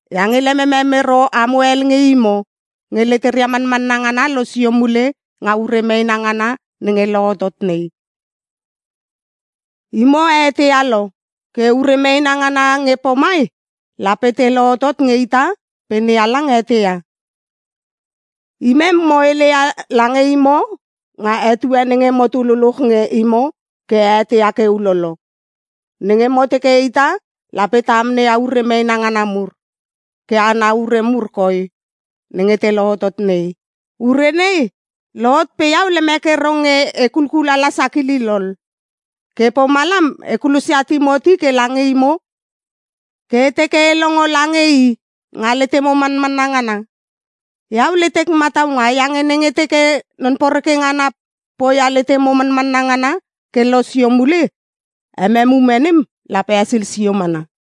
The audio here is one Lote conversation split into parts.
iange lememem ero amo hel nge imo nge leteria manmanna ngana losio mule nga ure meena ngana nenge lohotot nei. Imo a eteia lo ke ure meena ngana nge pomai lape te lohotot nge ita pe NeHalang eteia. Imem mo heleia lange imo nga etue nenge motu luluch nge imo ke a eteia ke ulolo - nenge mo teke ita lape ta amneia ure meena ngana mur. Ke ana ure mur koi nenge te lohotot nei. Ure nei lohot pe iau lemek ero nge e kulkulala sakilil ol, ke pomalam e kulosia Timoti ke lange imo ke e teke e longo lange i nga letemo manmanna ngana. Iau letek mataunga iange nenge teke Non poreke ngana poia letemo manmanna ngana ke losio mule, emem ume nem lape hesil sio mana.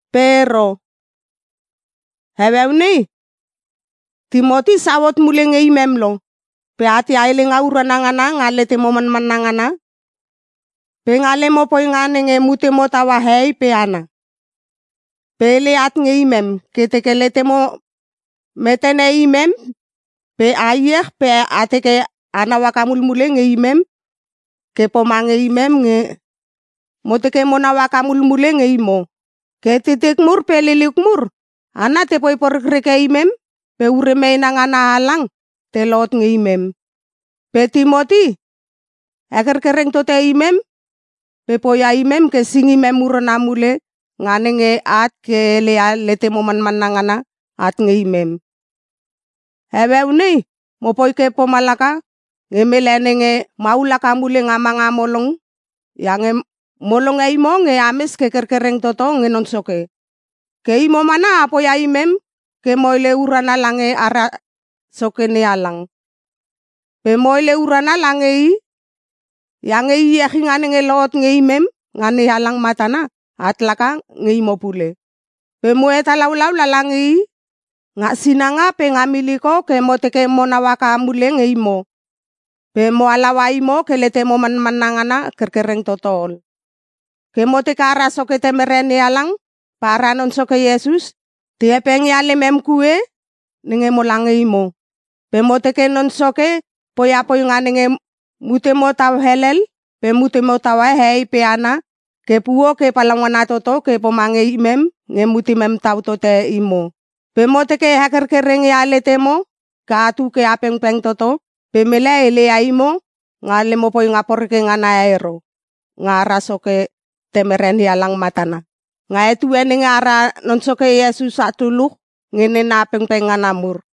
Pe ero, heueu nei Timoti sau hot mule nge imem lo, pe atia helenga urana ngana nga letemo manmanna ngana pe nga lemo poinga nenge mutemo taua hehei pe hana. Pe hele at nge imem ke teke letemo metene imem pe a iech pe a teke anau haka mulmule nge imem ke pomange imem nge mo teke monau haka mulmule nge imo. Ke titik mur pe liliuk mur, hana tepoi porekreke imem pe ure meena ngana halang te lohot nge imem. Pe Timoti hekerkereng tote imem pe poia imem ke singimem urana mule nga nenge at ke heleia letemo manmanna ngana at nge imem. Heueu nei mopoi ke pomalaka nge mele nenge maul haka mule nga manga molong iange mo longe imo nge ames ke kerkereng toto nge Non Soke. Ke imo mana a poia imem ke mo hele urana lange ara Soke NeHalang. Pe mo hele urana lange I iange iechinga nenge lohot nge imem nga NeHalang matana, at laka nge imo pule. Pe mo hetalaulau lala nge i nga sinanga pe nga miliko ke mo teke monau haka mule nge imo pe mo halaua imo ke letemo manmanna ngana kerkereng toto ol. Ke mo teke ara Soke Temere NeHalang pe ara Non Soke Iesus te hepengia lemem kue nenge mola nge imo. Pe mo teke Non Soke poia poinga nenge mutemo tau helel pe mutemo taua hehei pe hana ke puo ke palaungana toto ke pomange imem nge mutemem tau tote imo. Pe mo teke hekerkereng ia letemo ke atu ke a pengpeng toto pe mele heleia imo nga lemo poinga poreke ngana e ero, nga ara Soke Temere NeHalang matana, nga etue nenge ara Non Soke Iesus at luluch nge nena pengpeng ngana mur.